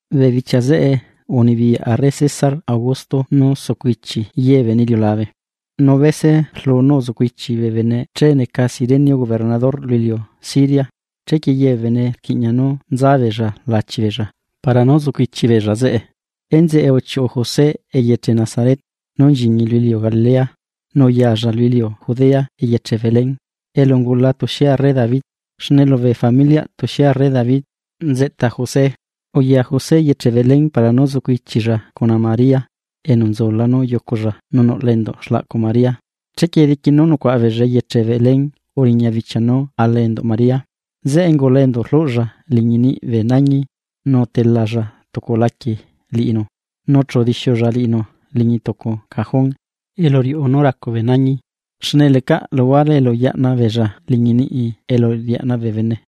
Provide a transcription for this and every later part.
Bee bichia zeꞌe, unibiyaꞌ arre César Augusto nú sucu ichi ye bee bene iliulabe. Nu bese rlu nú uzucu ichi bee bene che neca Cirenio gobernador lu iliu Siria. Chequie ye bee bene rquiꞌña nú nza beella lachi beella para nú zucu ichi beella zeꞌe. Enzeꞌe, uchiuꞌu José eyeche Nazaret, nú nchiñi lu iliu Galilea, nu uyalla lu iliu Judea eyeche Belén, elu ungula tuxie arre David, xne lubee familiꞌ tuxie arre David nzeꞌta José. Uya José eyeche Belén para nú zucu ichilla cuna María, enu nzula nú yuculla nu nuꞌla enduꞌ xlaꞌcu María. Chequie diqui nú nucuaꞌa beella eyeche Belén, uriña bichia nú ala enduꞌ María. Zeꞌe ungula enduꞌ rluꞌlla liñi niꞌ bee nañi nu utelalla tucu laquie liꞌinu nu chu udixiulla liꞌinu liñi tucu cajón elu riuꞌu nú racu bee nañi, xne lecaꞌ luhuare elu yaꞌna beella liñi niꞌi elu riaꞌna bee bene.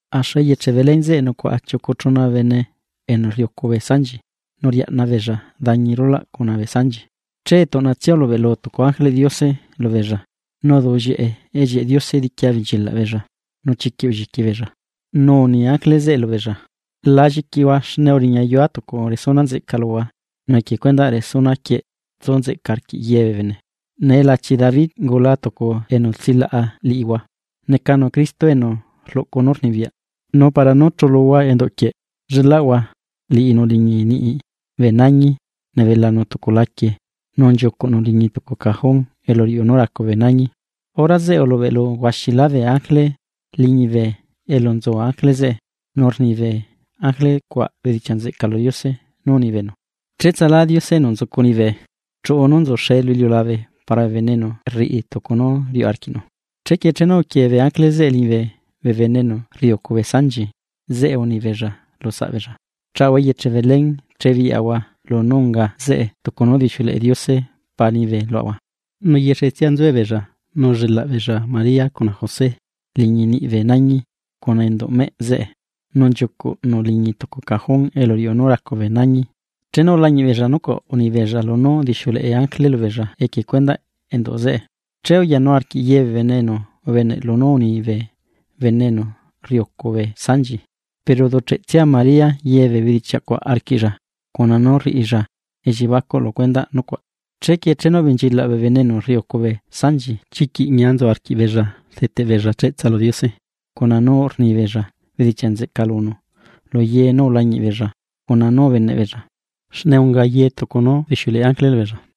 Axu eyeche Belén zeꞌe nucuaꞌa chiucu chuna bene enu rriucu bee sanchi nu riaꞌna beella dañi rula cuna bee sanchi. Che tuꞌnatsia ulubeꞌlu tucu ángeleꞌ Diose lubeella, nu uduꞌllieꞌe ellieꞌe Diose diqui abenchilaꞌ beella, nu chiquiꞌ ulliqui beella. Nu uni ángele zeꞌe lubeella: ―La lliquihua, xne uriñayua tucu resuna nzeꞌca luhua, nu equie cuendaꞌ resuna quieꞌ tsu nzeꞌca arquiꞌ ye bee bene. Nee lachi David ungula tucu enu tsilaꞌa liꞌihua, necanu Cristo, enu rluꞌcu nú rnibiyaꞌ. Nu para nú chuluhua enduꞌ quieꞌ, llelaꞌhua liꞌinu liñi niꞌi bee nañi nebelanu tucu laquie nu nchiucuꞌnu liñi tucu cajón elu riuꞌu nú racu bee nañi. Hora zeꞌe ulubeꞌlu huaxilá bee ángele liñibe elu nzu ángele zeꞌe, nu rni bee ángele cuaꞌ bedichiaꞌ nzeꞌca lu Diose nú uni beenu: ¡Cheꞌtsalá Diose enu nzucu liñibe! ¡Chuꞌu nú nzuxee lu iliulabe, para bee bene enu rriꞌi tucu nú riuꞌ arquiꞌnu! Chequie chenu uquie bee ángele zeꞌe liñibe, bee bene enu rriucu bee sanchi zeꞌe uni beella lusaꞌbeella: ―Chaahua eyeche Belén, che biꞌyaꞌahua lunú unga zeꞌe tucu nú udixiuleꞌe Diose Pa liñibe luaꞌahua. Nu yexetsia nzuebeella nu ullelaꞌ beella María cuna José liñi niꞌ bee nañi cuna enduꞌ meꞌ zeꞌe, nu nchiucuꞌnu liñi tucu cajón elu riuꞌu nú racu bee nañi. Chenu ulañiꞌ beella nucuaꞌ, uni beella lunú udixiuleꞌe ángele lubeella equie cuendaꞌ enduꞌ zeꞌe, che uyanu arquiꞌ ye bee bene enu ubeneꞌ lunú uni bee bene enu rriucu bee sanchi. Pero uducheꞌtsia María ye bee bedichiaꞌ cuaꞌ arquiꞌlla, cuna nú rriꞌilla elliebacuꞌ lu cuendaꞌ nucuaꞌ. Chequie chenu ubenchilaꞌ bee bene enu rriucu bee sanchi chiquiꞌ ñia nzu arquiꞌ beella rdeteꞌ beella cheꞌtsa lu Diose, cuna nú rni beella bedichiaꞌ nzeꞌca lunu lu ye nú ulañiꞌ beella cuna nú ubeneꞌ beella, xne unga ye tucu nú udixiuleꞌe ángele lubeella.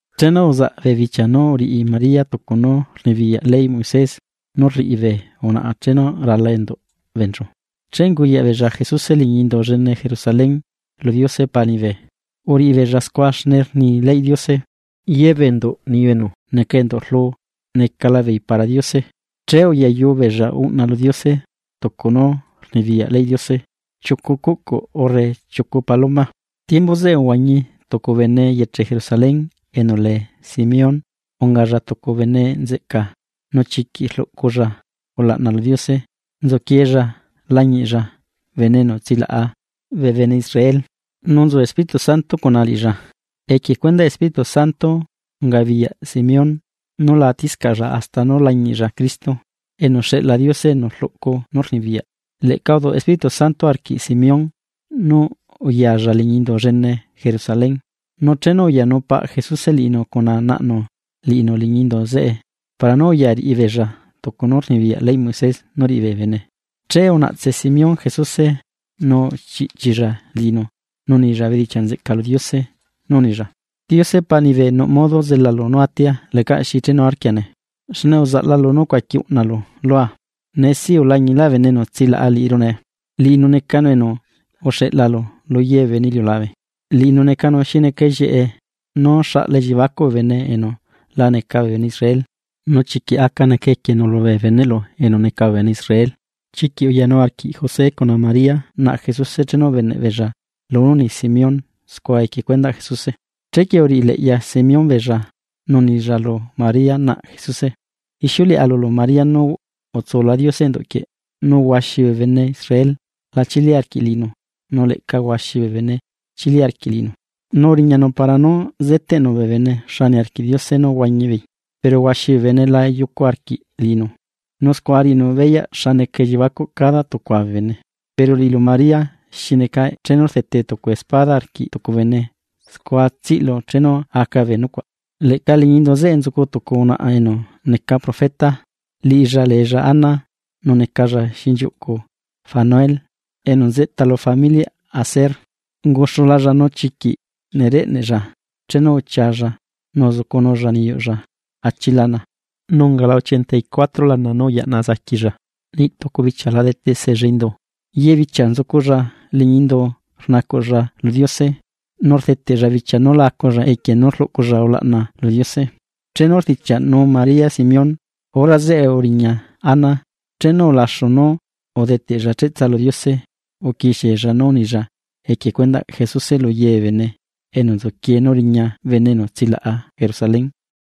Chenu uzaꞌ bee bichia nú uriꞌi María tucu nú rnibiyaꞌ leyꞌ Moisés nú rriꞌi bee unaꞌa chenu rala enduꞌ beenchu, che unguyaꞌ beella Jesuse liñi indu llene Jerusalén lu Diose Paa liñibe. Uriꞌi beella scua, xne rni leyꞌ Diose: “Ye bee enduꞌ niyu enu neca enduꞌ rlu necala beei para Diose.” Che uyayu beella uꞌna lu Diose tucu nú rnibiyaꞌ leyꞌ Diose, chiucu cuꞌcu urre chiucu paloma. Tiembu zeꞌe uhuañi tucu bene eyeche Jerusalén enu lee Simeón. Ungalla tucu bene nzeꞌca, nu chiquiꞌ rluꞌculla ulaꞌna lu Diose nzuquieella lañiꞌlla bene enu tsilaꞌa bee bene Israel. Nu nzu Espíritu Santo cuna liꞌilla, equie cuendaꞌ Espíritu Santo ungabiyaꞌ Simeón nú la atiscaꞌlla hasta nú lañiꞌlla Cristo, enu xeꞌla Diose enu rluꞌcu nú rnibiyaꞌ. Leꞌca uduꞌ Espíritu Santo arquiꞌ Simeón nú uyalla liñi indu llene Jerusalén. Nu chenu uyanu paꞌ Jesuse liꞌinu cuna naꞌnu liꞌinu liñi indu zeꞌe para nú uya riꞌi beella tucu nú rnibiyaꞌ leyꞌ Moisés nú riꞌi bee bene, che unaꞌtse Simeón Jesuse nu uchiꞌchilla liꞌinu nu unilla bedichiaꞌ nzeꞌca lu Diose, nú unilla: Diose Paa liñibe nuꞌ modo zelalu nú atia lecaꞌ xi chenuarquia nee, xne uzaꞌla lunú ucuaqui uꞌnalu lua. Nee si ulañilá bene enu tsilaꞌa liꞌiru nee, liꞌinu necanu, enu uxeꞌlalu lu ye bee bene iliulabe, Liꞌinu necanu xi neca ellieꞌe nú xaꞌla elliebacuꞌ bee bene enu la neca bee bene Israel. Nu chiquiꞌ aca neca equienu lubee beneꞌlu enu neca bee bene Israel. Chiquiꞌ uyanu arquiꞌ José cuna María naꞌ Jesuse chenu ubeneꞌ beella lunú uni Simeón scua equie cuendaꞌ Jesuse. Chequie uriꞌi leꞌya Simeón beella, nu unilla lu María, naꞌ Jesuse: ―Ixiuleꞌa lulu María nú utsula Diose enduꞌ quieꞌ, nú huaxi bee bene Israel la chili arquiꞌ liꞌinu, nu leꞌca huaxi bee bene chili arquiꞌ liꞌinu, nu uriñanu para nú zeteꞌnu bee bene xa niarquiꞌ Diose nú huañi beei, pero huaxi bee bene la yucu arquiꞌ liꞌinu. Nu scua riꞌinu beyaꞌ xa neca elliebacuꞌ cada tucua bee bene. Pero liꞌilu María xi neca chenu rdete tucu espada arquiꞌ tucu bene scua tsiꞌlu chenu aca bee nucuaꞌ. Leꞌca liñi indu zeꞌe nzucu tucu unaꞌa enu neca profeta. Liꞌilla leella Ana, nu necalla xinchiuꞌcu Fanuel enu nzeꞌta lu familiꞌ Aser, unguxulalla. Nu chiquiꞌ nereꞌneꞌlla chenu uchialla nu uzucunulla niyuꞌlla achi lana, nu ungala ochenta y cuatro lana nú uyaꞌna zaquilla. Niꞌ tucu bichia la dete seella indu, ye bichia nzuculla liñi indu rnacuꞌlla lu Diose, nu rdeteꞌlla bichia nú la aculla equie nú rluꞌculla ulaꞌna lu Diose. Chenu rdichiaꞌnu María Simeón, hora zeꞌe uriña Ana, chenu ulaxu nú udeteꞌlla cheꞌtsa lu Diose uquixiella nú unilla equie cuendaꞌ Jesuse lu ye bee bene enu nzuquie nú riña bene enu tsilaꞌa Jerusalén.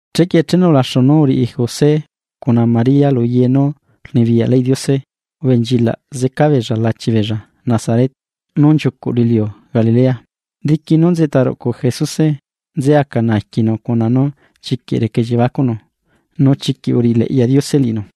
Chequie chenu ulaxu nú uriꞌi José cuna María lu ye nú rnibiyaꞌ leyꞌ Diose, ubenchilaꞌ zeca beella lachi beella Nazaret nú nchiucuꞌ lu iliu Galilea. Diqui nú nzeꞌta ruꞌcu Jesuse, nze aca naaquinu cuna nú chiquiꞌ reca elliebacuꞌnu nu chiquiꞌ uriꞌileꞌya Diose liꞌinu.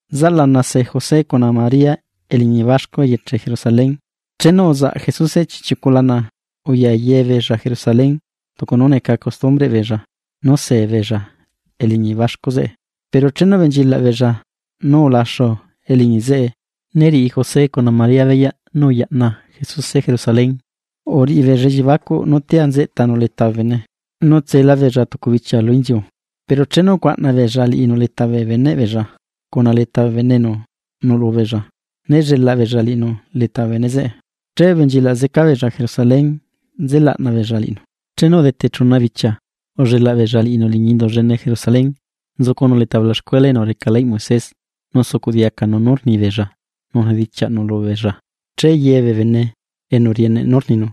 Zaꞌlana se José cuna María eliñi baxcu eyeche Jerusalén. Chenu uzaꞌ Jesuse chiꞌchiucu lana, uya ye beella Jerusalén, tucu nú neca costumbreꞌ beella nú see beella eliñi baxcu zeꞌe. Pero chenu ubenchilaꞌ beella nú ulaxu eliñi zeꞌe, né riꞌi José cuna María beyaꞌ nú uyaꞌna Jesuse Jerusalén. Uriꞌi beella elliebacuꞌ nú tia nzeꞌtanu leta bee bene, nu utsela beella tucu bichia lu inziu, pero chenu ucuaꞌna beella liꞌinu leta bee beneꞌ beella, cuna leta bee bene enu nuꞌlu beella, né llelaꞌ beella liꞌinu leta bee bene zeꞌe. Che ubenchilaꞌ zeca beella Jerusalén nze laꞌna beella liꞌinu. Chenu udete chuna bichia ullelaꞌ beella liꞌinu liñi indu llene Jerusalén, nzucunu leta bee ulaxcuela enu reca leyꞌ Moisés, nu sucuꞌ diacanu nú rni beella nu rdichiaꞌnunu beella. Che ye bee bene enu rieneꞌ nú rninu,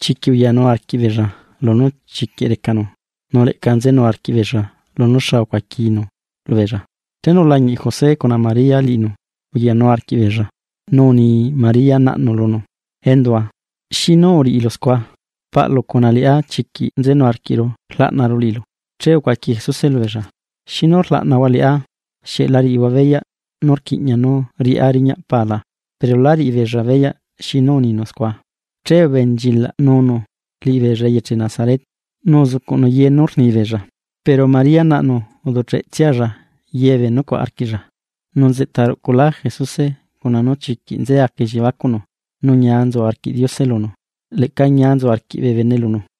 chiquiꞌ uyanu arquiꞌbeella lunú chiquiꞌ recanu, nu leꞌca nzenu arquiꞌbeella lunú xa ucuaquinu lubeella. Chenu ulañiꞌ José cuna María liꞌinu, uyanu arquiꞌbeella, nu uni María naꞌnu lunu: ―Endua, ¿xinu uriꞌilu scua? Paꞌlu cuna liꞌá chiquiꞌ nzenu arquiꞌru rlaꞌnaru liꞌilu. Che ucuaqui Jesuse lubeella: ―¿Xinu rlaꞌnahua liꞌá? ¿Xieꞌ la riꞌihua beyaꞌ nú rquiꞌña nú riꞌá riñaꞌ paa la? Pero lá riꞌi beella beyaꞌ xinu uninu scua. Che ubenchilaꞌnunu liꞌibeella eyeche Nazaret, nu uzucuꞌnu ye nú rni beella, pero María naꞌnu uducheꞌtsialla ye bee nucuaꞌ arquiꞌlla. Nu nzeꞌta ruꞌculá Jesuse cuna nú chiquiꞌ nze aca elliebacuꞌnu, nu ñia nzu arquiꞌ Diose lunu. Leꞌca ñia nzu arquiꞌ bee bene lunu.